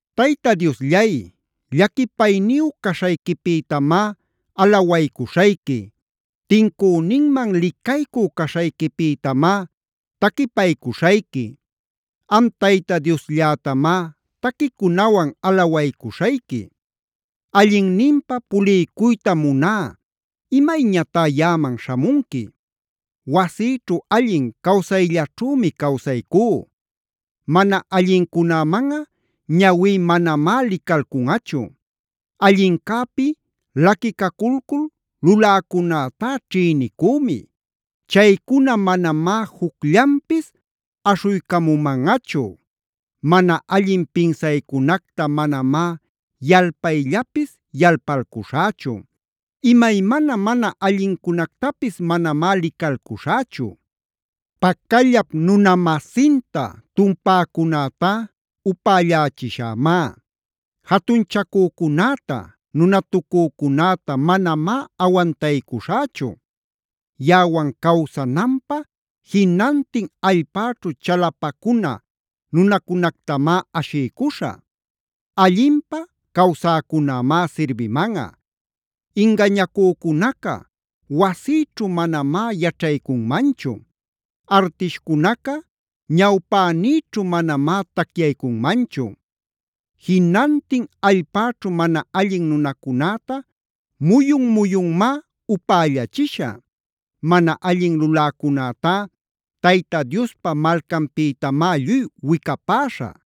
Tayta Diosllay, llaquipayniyu caśhayquipïtamá alawaycuśhayqui; tincüninman licaycü caśhayquipïtamá taquipaycuśhayqui. Am Tayta Diosllätamá taquicunawan alawaycuśhayqui. Allinninpa puliycuytam muná, ¿imayñatá yaꞌaman śhamunqui? Wasïćhu allin cawsayllaćhümi cawsaycú. Mana allincunämanꞌa ñawí manamá licalcunꞌachu. Allincäpi laquicaculcul luläcunätá ćhïnicümi. Chaycuna manamá jucllanpis aśhuycamumanꞌachu. Mana allin pinsaycunacta manamá yalpayllapis yalpalcuśhächu. Imaymana mana allincunactapis manamá licalcuśhächu. Pacallap nuna-masinta tumpäcunätá upällächishämá. Jatunchacücunäta, nunatucücunäta manamá awantaycuśhächu. Yaꞌawan cawsananpä jinantin allpäćhu chalapacuna nunacunactamá ashiycuśhä. Allinpä cawsäcunämá sirbimanꞌa. Ingañacücunaca wasïćhu manamá yaćhaycunmanchu. Artishcunaca ñawpänïćhu manamá tacyaycunmanchu. Jinantin allpäćhu mana allin nunacunäta muyun-muyunmá upällachishä. Mana allin luläcunätá Tayta Diospa malcanpïtamá lluy wicapäśhä.